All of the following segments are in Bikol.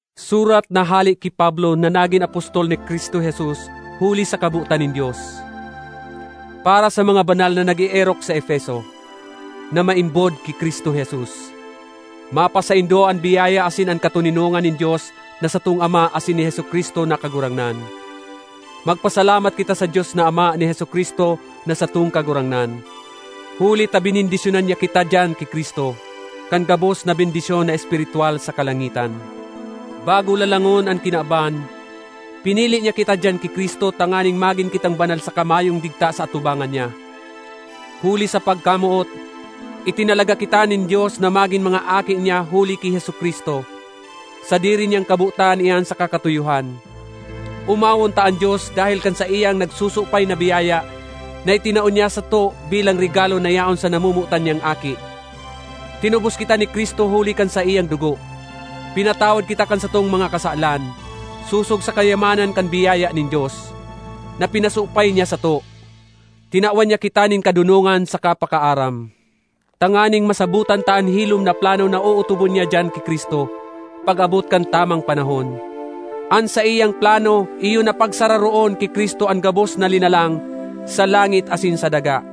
Surat na hale ki Pablo na nagin apostol ni Cristo Jesus huli sa kabotan nin Dios. Para sa mga banal na nag-eerok sa Efeso, na maimbod ki Cristo Jesus: Mapasaindo an biyaya asin an katoninongan nin Dios na satong Ama asin ni Jesu-Cristo na Kagurangnan. Magpasalamat kita sa Dios na Ama ni Jesu-Cristo na satong Kagurangnan! Huli ta benendisyonan niya kita diyan ki Cristo, kan gabos na bendisyon na espiritwal sa kalangitan. Bago lalangon an kinaban, pinili niya kita diyan ki Cristo tanganing magin kitang banal saka mayong digta sa atubangan niya. Huli sa pagkamoot, itinalaga kita nin Dios na magin mga aki niya huli ki Jesu-Cristo; sadiri niyang kabotan iyan saka katuyohan. Omawon ta an Dios dahel kan saiyang nagsusupay na biyaya na itinao niya sato bilang regalo na yaon sa namomotan niyang Aki! Tinubos kita ni Cristo huli kan saiyang dugo, pinatawad kita kan satong mga kasalan, sosog sa kayamanan kan biyaya nin Dios, na pinasupay niya sato! Tinawan niya kita nin kadonongan saka pakaaram, tanganing masabotan ta an hilom na plano na ootobon niya diyan ki Cristo, pag-abot kan tamang panahon. An saiyang plano iyo na pagsararoon ki Cristo an gabos na linalang, sa langit asin sa daga.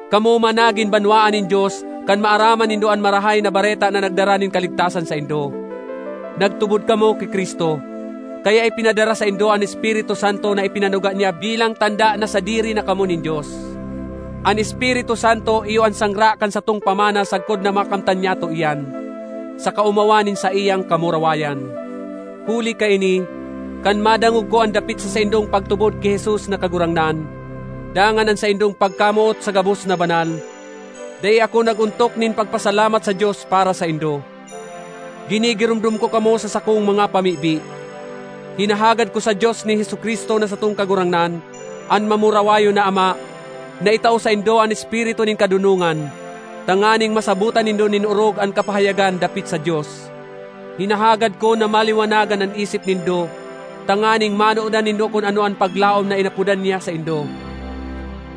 Kamo man nagin banwaan nin Dios kan maaraman nindo an Marahay na Bareta na nagdara nin kaligtasan saindo. Nagtubod kamo ki Cristo, kaya ipinadara saindo an Espiritu Santo na ipinanuga niya bilang tanda na sadiri na kamo nin Dios. An Espiritu Santo iyo an sangra kan satong pamana sagkod na makamtan nyato iyan, sa kaomawan nin saiyang kamurawayan! Huli kaini, kan madangog ko an dapit sa saindong pagtubod ki Jesus na Kagurangnan, dangan an saindong pagkamoot sa gabos na banal, dai ako nag-ontok nin pagpasalamat sa Dios para saindo. Ginigiromdom ko kamo sa sakong mga pamibi; hinahagad ko sa Dios ni Jesu-Cristo na satong Kagurangnan, an mamurawayon na Ama, na itao saindo an espiritu nin kadonongan, tanganing masabotan nindo nin orog an kapahayagan dapit sa Dios. Hinahagad ko na maliwanagan an isip nindo tanganing manodan nindo kun ano an paglaom na inapodan niya saindo,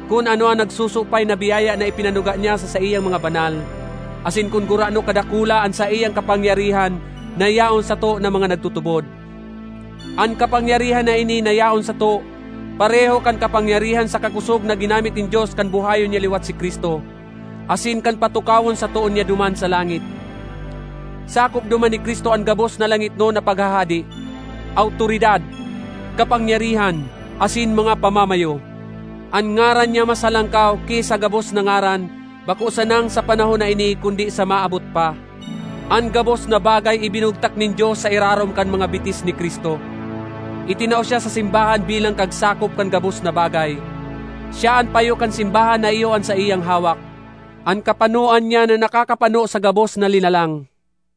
kun ano an nagsusupay na biyaya na ipinanuga niya sa saiyang mga banal, asin kun gurano kadakula an saiyang kapangyarihan na yaon sato na mga nagtutubod. An kapangyarihan na ini na yaon sato pareho kan kapangyarihan saka kosog na ginamit nin Dios kan buhayon niya liwat si Cristo, asin kan patukawon sa too niya duman sa langit. Sakop duman ni Cristo an gabos na langitnon na paghahade, awtoridad, kapangyarihan, asin mga pamamayo; an ngaran niya mas halangkaw ki sa gabos na ngaran, bako sanang sa panahon na ini kundi sa maabot pa. An gabos na bagay ibinugtak nin Dios sa irarom kan mga bitis ni Cristo. Itinao siya sa simbahan bilang kagsakop kan gabos na bagay. Siya an payo kan simbahan na iyo an saiyang hawak, an kapanoan niya na nakakapano sa gabos na linalang.